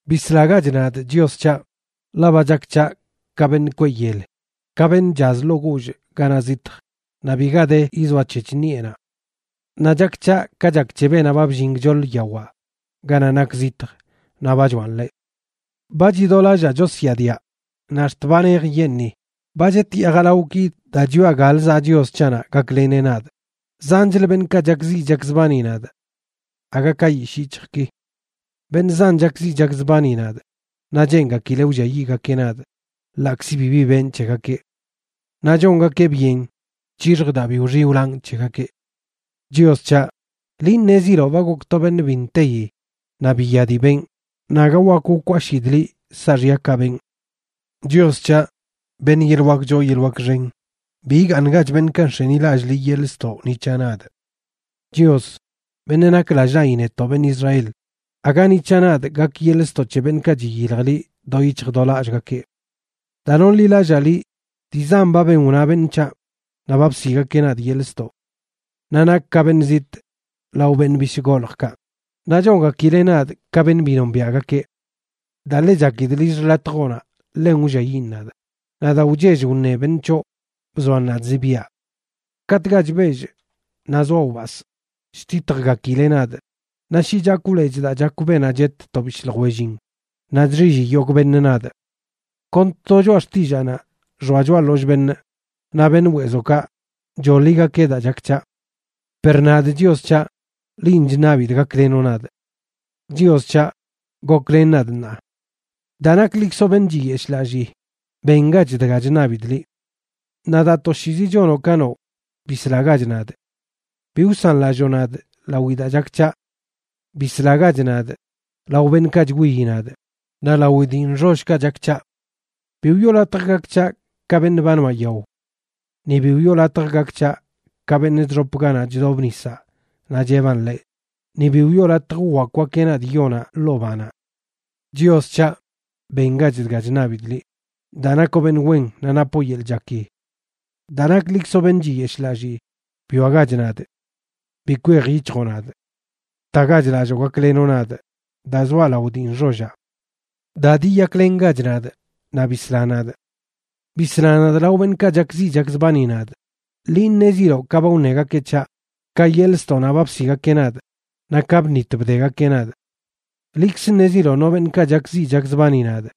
Bislagach nadꞌ, Chios c̱haꞌ, ḻaꞌ ba chak c̱haꞌ ka beṉꞌ kweꞌ yel, ka beṉꞌ chaz ḻoo guullꞌ ganaꞌ zitj, naꞌ bi ga de yizoac̱hec̱h ṉiꞌenaꞌ. Naꞌ chak c̱haꞌ ka chak c̱he beenaꞌ ba bllin gchoḻ yawaꞌ ganaꞌ nak zitj naꞌ ba choaꞌn ḻeꞌ. Ba chidolallaa chosyaadiaꞌ, naꞌ ax̱t ba nej yenꞌni; ba chetyaa jalawꞌki daa chwiaꞌ galə zaꞌ Chios c̱haꞌnaꞌ gakleneꞌ nadꞌ. Zanchlə beṉꞌkaꞌ chakziꞌ chakzbani nadꞌ aga ka yishꞌ yic̱hjꞌki. Beṉꞌ zan chakziꞌ chakzbani nadꞌ naꞌ cheengakileꞌ wlliayiꞌgakeꞌ nadꞌ ḻaꞌkzi bibi benꞌ c̱hegakeꞌ. Naꞌ chongakeꞌ byen c̱hixjꞌ daa bi wxiꞌ wlanꞌ c̱hegakeꞌ. Chios c̱haꞌ, liꞌ ṉeziloꞌ ba gokꞌ to beṉꞌ bi nteyi naꞌ biya dii benꞌ, naꞌ aga wak wkwashidꞌ liꞌ saaxyakaꞌ benꞌ. Chios c̱haꞌ, beṉꞌ yeḻꞌ wak choo yeḻꞌ wak xen, bi igaaṉgach beṉꞌkaꞌ nx̱enilallꞌ liꞌ yeḻꞌ ztoꞌ ni c̱haꞌ nadꞌ. Chios, beṉꞌ nak lallꞌ naꞌyi netoꞌ beṉꞌ Israel, aga ni c̱haꞌ nadꞌ gak yeḻꞌ ztoꞌ c̱he beṉꞌkaꞌ chiyilj liꞌ do yic̱hj do lallꞌgakeꞌ. Daa nonḻilallaa liꞌ, dii zan ba ben wna beṉꞌ c̱haꞌ; naꞌ ba bsiꞌgakeꞌ nadꞌ yeḻꞌ ztoꞌ. Naꞌ nakꞌ ka beṉꞌ zitꞌ lao beṉꞌ bishꞌ goljꞌkaꞌ, naꞌ chongakileꞌ nadꞌ ka beṉꞌ bi nombiaꞌgakeꞌ. Daa ḻe chakidꞌ lill xḻatjoꞌnaꞌ ḻen wlliayiꞌn nadꞌ; naꞌ daa wchell wṉe beṉꞌ c̱hoꞌ bzoan nadꞌ zibiaꞌ. Katꞌkaꞌ chbellꞌ naꞌ zoaꞌ wbasꞌ, chtitjgakileꞌ nadꞌ; naꞌ shi chakwꞌ lechꞌ daa chakw beenaꞌ chet to bishꞌ ljwellin, naꞌ chxilli yogꞌ beṉꞌ nadꞌ. Kon to choꞌa xtillaanaꞌ xoa choꞌa ḻollꞌ beṉꞌ, naꞌ beṉꞌ weezokaꞌ choḻigakeꞌ daa chak c̱haꞌ. Per nadꞌ, Chios c̱haꞌ, linꞌ chṉabidꞌ gaklenoꞌ nadꞌ. Chios c̱haꞌ, ¡goklen nadꞌ ṉaa! Daa naklikzoꞌ beṉꞌ chiyeshlallii, ¡bengach dga chṉabidꞌ liꞌ! Naꞌ daa toshiizi chonoꞌ ka noꞌ, ¡bislagach nadꞌ! Bi wsanlalloo nadꞌ lawi daa chak c̱haꞌ. Bislagach nadꞌ lao beṉꞌkaꞌ chwiyi nadꞌ naꞌ lawi dii nxollkaꞌ chak c̱haꞌ. Bi wiꞌo latj gak c̱haꞌ ka beṉꞌ ba noaꞌ yao. Ni bi wiꞌo latj gak c̱haꞌ ka beṉꞌ chxop ganaꞌ chdob nisaꞌ naꞌ cheban ḻeꞌ, ni bi wiꞌo latj wwakwgakeꞌ nadꞌ yonaꞌ ḻoo banaꞌ. Chios c̱haꞌ, bengach dga chṉabidꞌ liꞌ, daa nakoꞌ beṉꞌ wen naꞌ napoꞌ yeḻꞌ chaki. Daa naklikzoꞌ beṉꞌ chiyeshlallii, bwiagach nadꞌ. Bi kwejyic̱hjoꞌ nadꞌ. Btagach lalloo gaklenoꞌ nadꞌ, daa zoaꞌ lao dii nxollaꞌ. Da diyaklengach nadꞌ, naꞌ bisla nadꞌ. ¡Bisla nadꞌ lao beṉꞌkaꞌ chakziꞌ chakzbani nadꞌ! Liꞌ ṉeziloꞌ ka ba wṉegakeꞌ c̱haꞌ, ka yeḻꞌ ztoꞌnaꞌ ba bsiꞌgakeꞌ nadꞌ, naꞌ ka bṉit bdegakeꞌ nadꞌ. Liꞌkz ṉeziloꞌ no beṉꞌkaꞌ chakziꞌ chakzbani nadꞌ.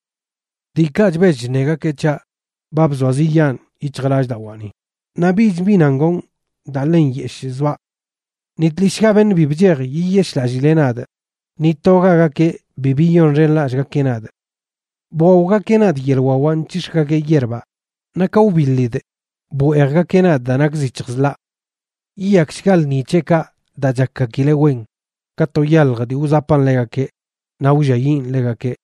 Diikaꞌ chbell chṉegakeꞌ c̱haꞌ ba bzoaziꞌyaan yic̱hjꞌlallꞌdawaani; naꞌ bich bi nan gonꞌ daa ḻe nyeshꞌ zoaꞌ. Ni tlishꞌga beṉꞌ bi bchej yiyeshꞌlallileꞌ nadꞌ, ni togagakeꞌ bi biyonxenlallꞌgakeꞌ nadꞌ. Bwaogakeꞌ nadꞌ yeḻꞌ wawaꞌ nc̱hix̱gakeꞌ yierbaꞌ naꞌ ka wbiḻidꞌ bweejgakeꞌ nadꞌ daa nak zic̱hjꞌ zḻaꞌ. Yiyakshga lṉi c̱heꞌkaꞌ daa chakgakileꞌ wen ka to yalj dii wzapan ḻegakeꞌ naꞌ wlliayiꞌn ḻegakeꞌ.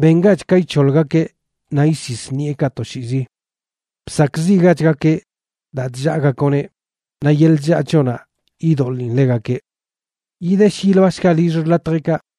Bengach ka ic̱hoḻgakeꞌ naꞌ isis ṉiꞌekaꞌ toshiizi. Bsakꞌziꞌgachgakeꞌ daa chllaagakoꞌneꞌ; naꞌ yeḻꞌ chllaa c̱hoꞌnaꞌ yidoḻin ḻegakeꞌ. Yidesh yiloashgaꞌ lill xḻatjeꞌkaꞌ,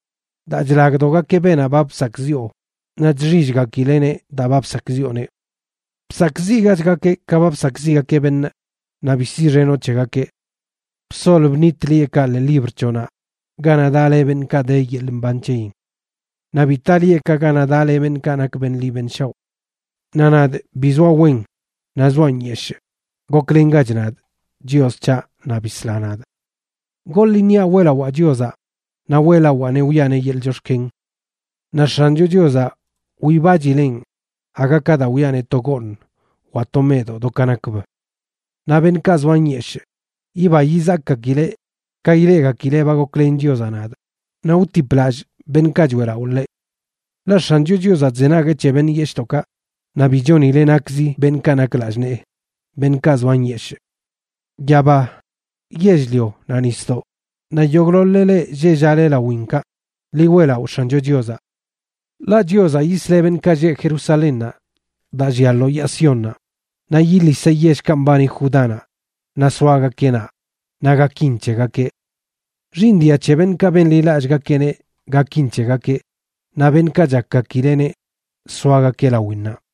daa chlagdogakeꞌ beenaꞌ ba bsakꞌziꞌo, naꞌ chxillgakileꞌneꞌ daa ba bsakꞌziꞌoneꞌ. Bsakꞌziꞌgachgakeꞌ ka ba bsakꞌziꞌgakeꞌ beṉꞌ, naꞌ bi siꞌxenoꞌ c̱hegakeꞌ. ¡Bsol bṉit lieꞌkaꞌ ḻee libr c̱hoꞌnaꞌ ganaꞌ daꞌ le beṉꞌkaꞌ de yeḻꞌ mban c̱heyin! Naꞌ bi taꞌ lieꞌkaꞌ ganaꞌ daꞌ le beṉꞌkaꞌ nak beṉꞌ ḻi beṉꞌ shaoꞌ. Naꞌ nadꞌ, bi zoaꞌ wen naꞌ zoaꞌ nyeshꞌ, goklengach nadꞌ, Chios c̱haꞌ, naꞌ bisla nadꞌ. Goḻ iṉiaꞌ weꞌlawaa Chiozaꞌ; naꞌ weꞌlawaaneꞌ wiꞌaneꞌ yeḻꞌ chox̱ken. Naꞌ X̱ancho Chiozaꞌ wibachilen aga ka daa wiꞌaneꞌ to gooṉ wa to meꞌdoꞌ do ka nakb. Naꞌ beṉꞌkaꞌ zoa nyeshꞌ yiba yizakgakileꞌ ka ileꞌgakileꞌ ba goklen Chiozaꞌ nadꞌ, naꞌ wtiplallꞌ beṉꞌkaꞌ choeꞌlaꞌo ḻeꞌ. Ḻaꞌ X̱ancho Chiozaꞌ chzenagueꞌ c̱he beṉꞌ yeshꞌdoꞌkaꞌ naꞌ bi chonileꞌ nakzi beṉꞌkaꞌ nak lallꞌ nee, beṉꞌkaꞌ zoa nyeshꞌ. Yaba, yell-lio naꞌ nisdoꞌ, naꞌ yogꞌḻoḻ-le leꞌ lleꞌ llaꞌle lawinkaꞌ, ḻi weꞌlaꞌo X̱ancho Chiozaꞌ. Ḻaꞌ Chiozaꞌ yisleꞌ beṉꞌkaꞌ lleꞌ Jerusalénnaꞌ daa llia lo yaa Siónnaꞌ, naꞌ yiliseꞌ yellkaꞌ mbani Judánaꞌ, naꞌ soagakeꞌ naꞌ, naꞌ gakin c̱hegakeꞌ. Xiiṉ dia c̱he beṉꞌkaꞌ benḻilallꞌgakeꞌneꞌ gakin c̱hegakeꞌ, naꞌ beṉꞌkaꞌ chakgakileꞌneꞌ soagakeꞌ lawinnaꞌ.